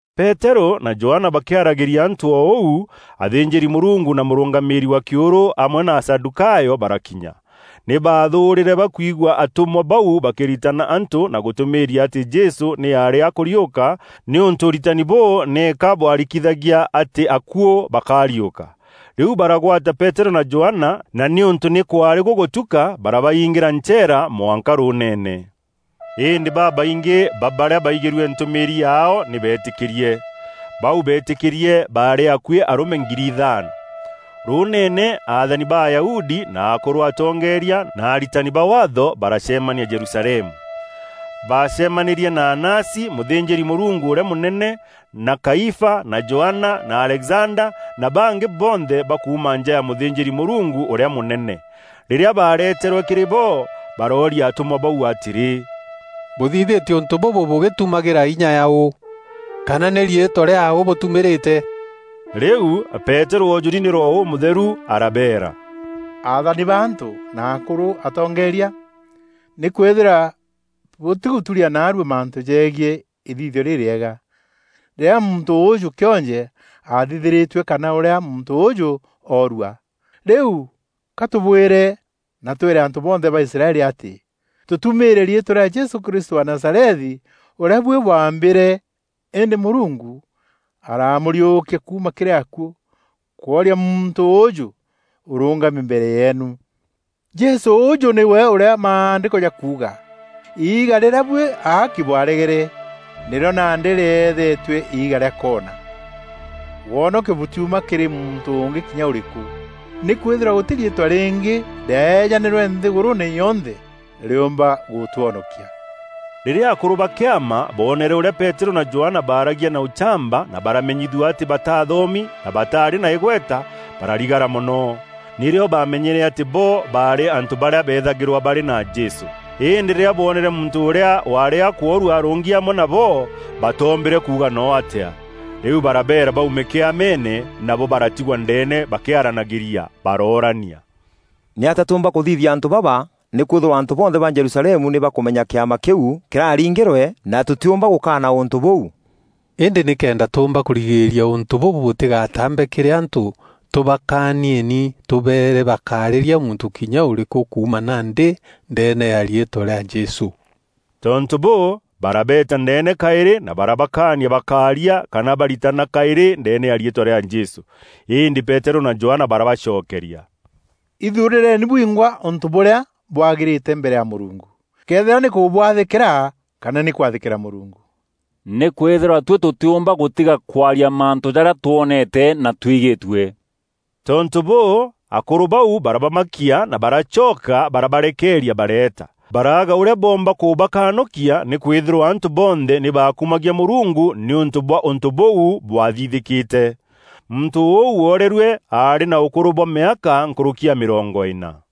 Peterû na Johana bakîaragîria antû o ûu, athînjîri-Mûrungu na mûrûngamîîri wa kîûrû amwe na Asadûkayo barakinya. Nî baathûûrîre bakwîgua atûmwa bau bakîritana antû na gûtûmîîria atî Jesû nî aarî akûriûka nîûntû ûritani bûû nîka bwarikithagia atî akuû bakariûka. Rîu baragwata Peterû na Johana, na nîûntû nî kwaarî gûgûtuka barabaingîra ncheera mwanka rûûneene. Îndî babaingî ba barîa baigîrue ntûmîîri yaao nî beetîkîrie. Bau beetîkîrie baarî akuî arûme ngiri ithaano. Rûûneene, athani ba Ayahudi na akûrû atongeeria na aritani ba Waatho baracemania Jerusalemu. Baacemanîrie na Anasi, mûthînjîri-Mûrungu ûrîa mûnene, na Kaifa na Johana na Alexanda na bangî bonthe ba kuuma nja ya mûthînjîri-Mûrungu ûrîa mûnene. Rîrîa baareeterwe kîrî bo, barooria atûmwa bau atîrî, “Bûthithîtie ûntû bûbû bûgîtumagîra inya yaaû? Kana nî riîtwa rîaaû bûtumîrîte?” Rîu Peterû oojûri nî Roho Ûmûtheru arabeera, “Aathani ba antû na akûrû atongeeria: Nîkwîthîrwa bûtîgûtûûria naarua mantû jegiî îthithio rîrîega, rîrîa muntû ûûjû kîonje athithîrîtue kana ûrîa muntû ûûjû oorua, rîu ka tûbwîre na twîre antû bonthe ba Israeli atî tûtumîîre riîtwa rîa Jesû Krîstû wa Nazarethi, ûrîa buî bwaambîîre, îndî Mûrungu aramûriûkia kuuma kîrî akuû, kwooria muntû ûûjû ûrûngami mbere yeenu. Jesû ûûjû nîwe ûrîa Maandîko jakuuga: ‘Iiga rîrîa buî aaki bwaregere, nîrîo nandî rîethetue iiga rîa koona.’ “Wonokio bûtiuma kîrî muntû ûngî kinya ûrîkû, nîkwîthîrwa gûtî riîtwa rîngî rîaejanîrwe nthîgûrûûne yonthe, rîûûmba gûtwonokia.” Rîrîa akûrû ba kîama boonere ûrîa Peterû na Johana baaragia na ûchamba na baramenyithua atî bataathomi na bataarî na îgweta, bararigara mono. Nîrîo baamenyere atî bo baarî antû barîa beethagîrwa barî na Jesû. Îndî rîrîa boonere muntû ûrîa waarî akûoorua arûngi amwe nabo, batoombîre kuuga no atîa. Rîu barabeera baume Kîameene, nabo baratigwa ndeene bakîaranagîria. Baroorania, “Nîatîa tûûmba kûthithîria antû baba nîkwîthîrwa antû bonthe ba Jerusalemu nî bakûmenya kîama kîu kîraringîrwe na tûtîûmba gûkaana ûntû bûu? Îndî nîkenda tûûmba kûrigîîria ûntû bûbû bûtîgataambe kîrî antû, tûbakaanieni tûbeere bakaarîria muntû kinya ûrîkû kuuma nandî ndeene ya riîtwa rîa Jesû.” Tontû bûû, barabeeta ndeene kaîrî na barabakaania bakaaria kana baritana kaîrî ndeene ya riîtwa rîa Jesû. Îndî Peterû na Johana barabacokeria, “Îthuurîreeni bwingwa ûntû bûrîa bwagîrîte mbere ya Mûrungu, këethîra nî kûbwathîkîra kana nî kwathîkîra Mûrungu. Nîkwîthîrwa tuî tûtîûmba gûtiga kwaria mantû jarîa twonete na twigîîtue.” Tontû bûû, akûrû bau barabamakia na baracoka barabarekeeria bareeta. Baraaga ûrîa boomba kûbakanûkia nîkwîthîrwa antû bonthe nî baakumagia Mûrungu nîûntû bwa ûntû bûu bwathithîkîte. Muntû ûu woorerue aarî na ûkûrû bwa mîaka nkûrûki ya mîrongo îna.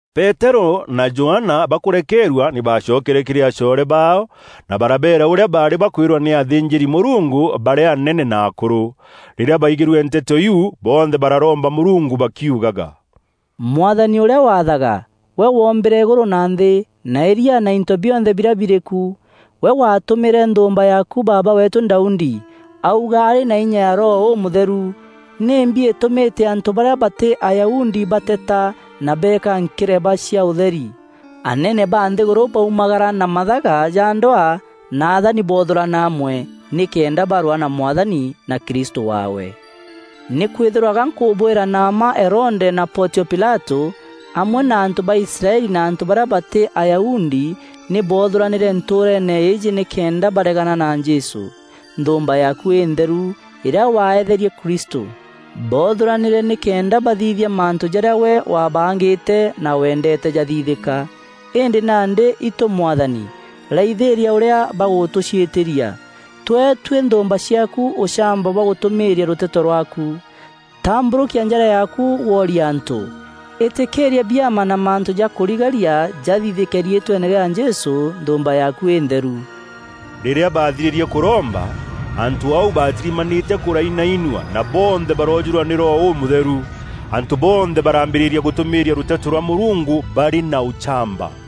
Peterû na Johana bakûrekeerua nî baacokere kîrî acoore baao na barabeera ûrîa baarî bakwîrwa nî athînjîri-Mûrungu barîa anene na akûrû. Rîrîa baigîrue nteto iu, bonthe bararomba Mûrungu bakiugaga, “Mwathani ûrîa waathaga, gwe woombîre îgûrû na nthî, na îria na into bionthe birîa birîku, gwe waatûmîre nthûûmba yaaku, baaba weetû Daudi, auga arî na inya ya Roho Ûmûtheru: ‘Nîmbi îtûmîte antû barîa batî Ayahudi bateeta, na beeka nkireba cia ûtheri? Anene ba nthîgûrû baumagara na mathaga ja ndwaa na athani boothûrana amwe, nîkenda barwaa na Mwathani na Krîstû waawe.’ “Nîkwîthîrwa ga nkûbwîra na mma Herode na Pontio Pilatû, amwe na antû ba Israeli na antû barîa batî Ayahudi nî boothûranîre ntûûreene îîjî nîkenda baregana na Jesû, nthûûmba yaaku întheru, îrîa waeetherie Kristû. Boothûranîre nîkenda bathithia mantû jarîa gwe waabangîte na weendeete jathithîka. Îndî nandî, itû Mwathani raithîîria ûrîa bagûtûciîtîria. Tûee tuî nthûûmba ciaaku ûchamba bwa gûtûmîîria rûteto rwaaku. Tambûrûkia njara yaaku woorie antû. Îtîkîîria biama na mantû ja kûrigaria jathithîke riîtweene rîa Jesû, Nthûûmba yaaku Întheru.” Rîrîa baathirîrie kûromba, antû au baatîrimanîte kûrainainua, na bonthe baroojûrwa nî Roho Ûmûtheru. Antû bonthe baraambîrîria gûtûmîîria rûteto rwa Mûrungu barî na ûchamba.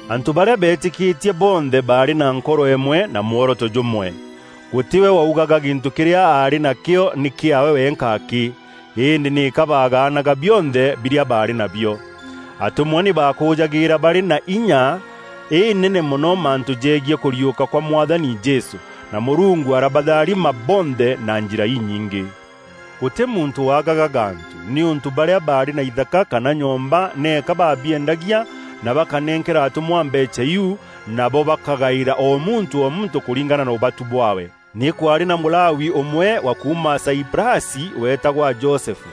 Antû barîa beetîkîtie bonthe baarî na nkoro îmwe na mworoto jûmwe. Gûtî we waugaga gîntû kîrîa aarî nakîo nî kîaawe wenka akî, îndî nîka baagaanaga bionthe birîa baarî nabio. Atûmwa nî baakûûjagîîra barî na inya înene mono mantû jegiî kûriûka kwa Mwathani Jesû, na Mûrungu arabatharima bonthe na njîra inyingî. Gûtî muntû waagaga gantû, nîûntû barîa baarî na ithaka kana nyomba nîka baabiendagia, na bakanenkera atûmwa mbeecha iu, nabo bakagaîra o muntû o muntû kûringana na ûbatu bwaawe. Nî kwaarî na Mûlawi ûmwe wa kuuma Saiprasi, weetagwa Josefu,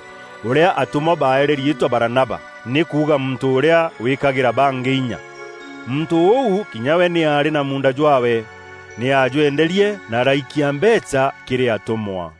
ûrîa atûmwa baeere riîtwa Baranaba (nî kuuga Muntû ûrîa wîîkagîra bangî inya). Muntû ûu kinya we nî aarî na muunda jwaawe. Nî aajwenderie na araikia mbeecha kîrî atûmwa.